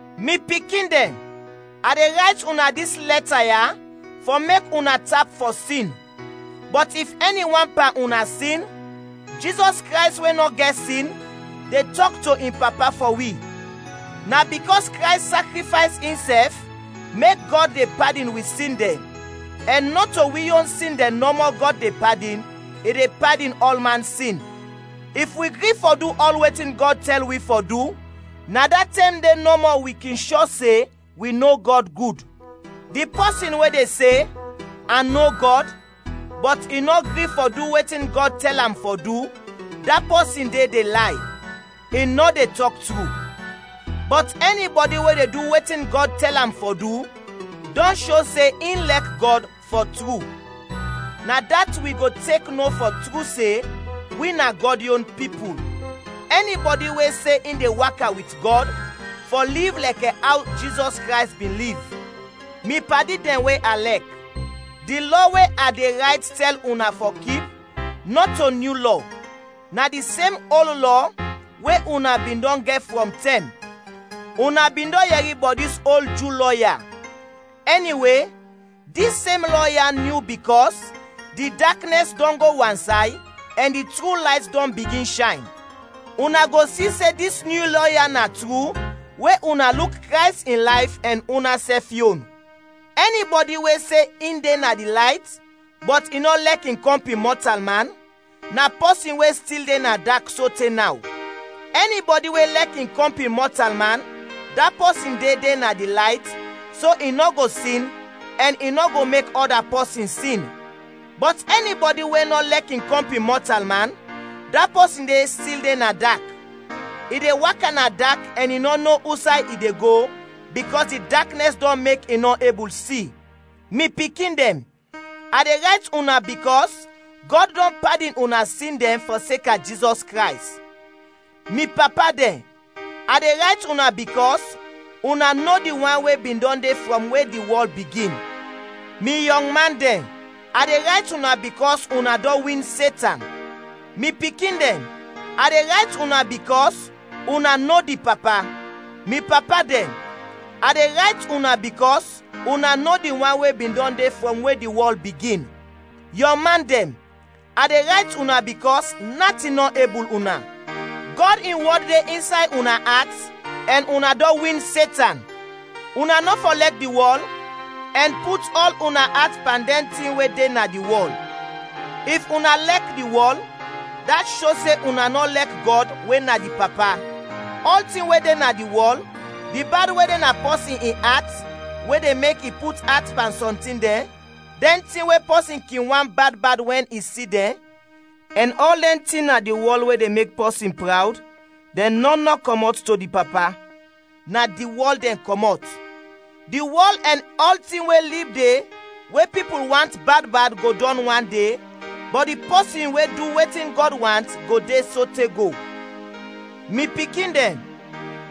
Mi pikin dɛn, a de rayt una dis lɛta ya fɔ mek una tap fɔ sin; bɔt if ɛni wan pan una sin, Jizɔs Krays we nɔ gɛt sin, de tɔk to in Papa fɔ wi. Na bikɔs Krays sakrifays insɛf mek Gɔd de padin wi sin dɛn, ɛn nɔto wi yon sin dɛn nɔmɔ Gɔd de padin, i de padin ɔlman sin. If wi gri fɔ du ɔl wetin Gɔd tɛl wi fɔ du, na da tɛm de nɔmɔ wi kin shɔ se wi no Gɔd gud. Di pɔsin we de se, “ A no Gɔd,” bɔt i nɔ gri fɔ du wetin Gɔd tɛl am fɔ du, da pɔsin de de lay; i nɔ de tɔk tru. Bɔt ɛni bɔdi we de du wetin Gɔd tɛl am fɔ du dɔn sho se in lɛk Gɔd, fɔ tru; na dat wi go tek no fɔ tru se wi na Gɔd yon pipul. Ɛni bɔdi we se in de waka wit Gɔd, fɔ liv lɛkɛ aw Jizɔs Krays bin liv. Mi padi dɛn we a lɛk, di lɔ we a de rayt tɛl una fɔ kip, nɔto nyu lɔ, na di sem ol lɔ we una bin dɔn gɛt frɔm tɛm. Una bin dɔn yɛri bɔt dis ol Ju lɔ ya. Ɛniwe, dis sem lɔ ya nyu bikɔs di daknɛs dɔn go wansay ɛn di tru layt dɔn bigin shayn, una go si se dis nyu lɔ ya na tru we una luk Krays in layf ɛn una sɛf yon. Ɛni bɔdi we se in de na di layt, bɔt i nɔ lɛk in kɔmpin mɔtalman, na pɔsin we stil de na dak sote naw. Ɛni bɔdi we lɛk in kɔmpin mɔtalman, da pɔsin de de na di layt, so i nɔ go sin, ɛn i nɔ go mek ɔda pɔsin sin. Bɔt ɛni bɔdi we nɔ lɛk in kɔmpin mɔtalman, da pɔsin de stil de na dak. I de waka na dak ɛn i nɔ no usay i de go, bikɔs di daknɛs dɔn mek i nɔ ebul si. Mi pikin dɛn, a de rayt una bikɔs Gɔd dɔn padin una sin dɛn fɔseka Jizɔs Krays. Mi papa dɛn, a de rayt una bikɔs una no di wan we bin dɔn de frɔm we di wɔl bigin. Mi yɔng man dɛn, a de rayt una bikɔs una dɔn win Setan. Mi pikin dɛn, a de rayt una bikɔs una no di Papa. Mi papa dɛn, a de rayt una bikɔs una no di wan we bin dɔn de frɔm we di wɔl bigin. Yɔng man dɛn, a de rayt una bikɔs natin nɔ ebul una. Gɔd in wɔd de insay una at ɛn una dɔn win Setan. Una nɔ fɔ lɛk di wɔl ɛn put ɔl una at pan dɛn tin we de na di wɔl. If una lɛk di wɔl, dat sho se una nɔ lɛk Gɔd we na di Papa. Ɔltin we de na di wɔl di bad we de na pɔsin in at we de mek i put at pan sɔm tin dɛn, dɛn tin we pɔsin kin want bad bad wɛn i si dɛn, ɛn ɔl dɛn tin na di wɔl we de mek pɔsin prawd dɛn nɔn nɔ kɔmɔt to di Papa, na di wɔl dɛn kɔmɔt. Di wɔl ɛn ɔltin we lib de we pipul want bad bad go dɔn wan de, bɔt di pɔsin we du wetin Gɔd want go de sote go. Mi pikin dɛn,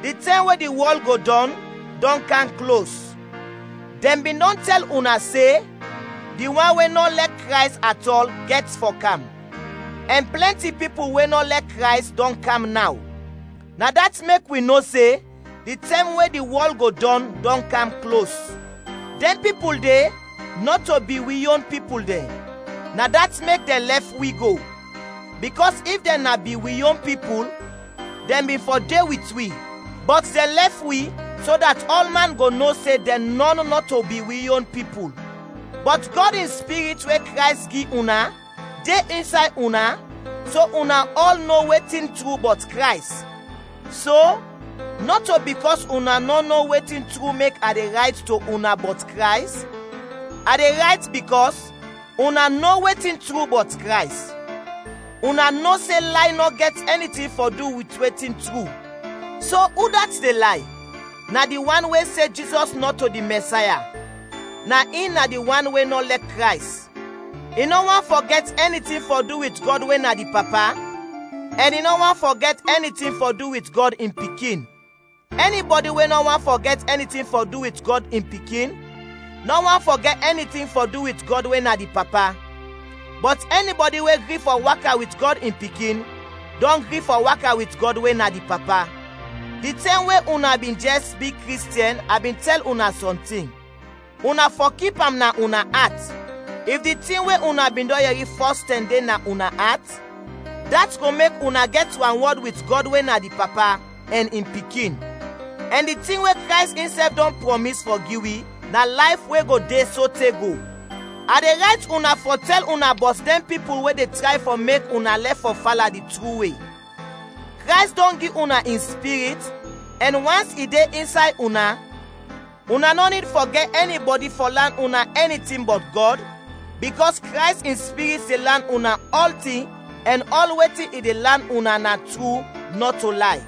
di tɛm we di wɔl go dɔn, dɔn kam klos. Dɛn bin dɔn tɛl una se di wan we nɔ lɛk Krays atɔl gɛt fɔ kam, ɛn plɛnti pipul we nɔ lɛk Krays dɔn kam naw; na dat mek wi no se di tɛm we di wɔl go dɔn, dɔn kam klos. Dɛn pipul de nɔto bin wi yon pipul dɛn, na dat mek dɛn lɛf wi go; bikɔs if dɛn na bin wi yon pipul, dɛn bin fɔ de wit wi. Bɔt dɛn lɛf wi so dat ɔlman go no se dɛn nɔn nɔto bin wi yon pipul. Bɔt Gɔd in Spirit we Krays gi una, de insay una, so una ɔl no wetin tru bɔt Krays. So, nɔto bikɔs una nɔ no wetin tru mek a de rayt to una bɔt Krays, a de rayt bikɔs una no wetin tru bɔt Krays. Una no se lay nɔ gɛt ɛni tin fɔ du wit wetin tru. So udat de lay? Na di wan we se Jizɔs nɔto di Mɛsaya, na in na di wan we nɔ lɛk Krays. I nɔ want fɔ gɛt ɛni tin fɔ du wit Gɔd we na di Papa ɛn i nɔ want fɔ gɛt ɛni tin fɔ du wit Gɔd in Pikin. Ɛni bɔdi we nɔ want fɔ gɛt ɛni tin fɔ du wit Gɔd in Pikin, nɔ want fɔ gɛt ɛni tin fɔ du wit Gɔd we na di Papa; bɔt ɛni bɔdi we gri fɔ waka wit Gɔd in Pikin, dɔn gri fɔ waka wit Gɔd we na di Papa. Di tɛm we una bin jɛs bi Kristiɛn a bin tɛl una sɔntin. Una fɔ kip am na una at. If di tin we una bin dɔn yɛri fɔs tɛm de na una at, dat go mek una gɛt wanwɔd wit Gɔd we na di Papa, ɛn in Pikin. Ɛn di tin we Krays insɛf dɔn prɔmis fɔ gi wi, na layf we go de sote go. A de rayt una fɔ tɛl una bɔt dɛn pipul we de tray fɔ mek una lɛf fɔ fala di tru we. Krays dɔn gi una in Spirit, ɛn wans i de insay una, una nɔ nid fɔ gɛt ɛni bɔdi fɔ lan una ɛni tin bɔt Gɔd, bikɔs Krays in Spirit de lan una ɔltin ɛn ɔl wetin i de lan una na tru, nɔto lay.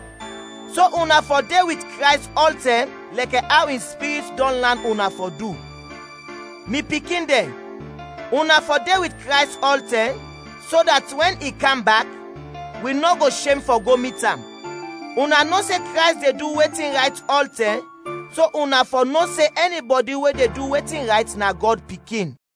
So una fɔ de wit Krays ɔltɛm lɛkɛ aw in Spirit dɔn lan una fɔ du. Mi pikin dɛn, una fɔ de wit Krays ɔltɛm, so dat wɛn i kam bak, wi nɔ go shem fɔ go mit am. Una no se Krays de du wetin rayt ɔltɛm, so una fɔ no se ɛni bɔdi we de du wetin rayt na Gɔd pikin.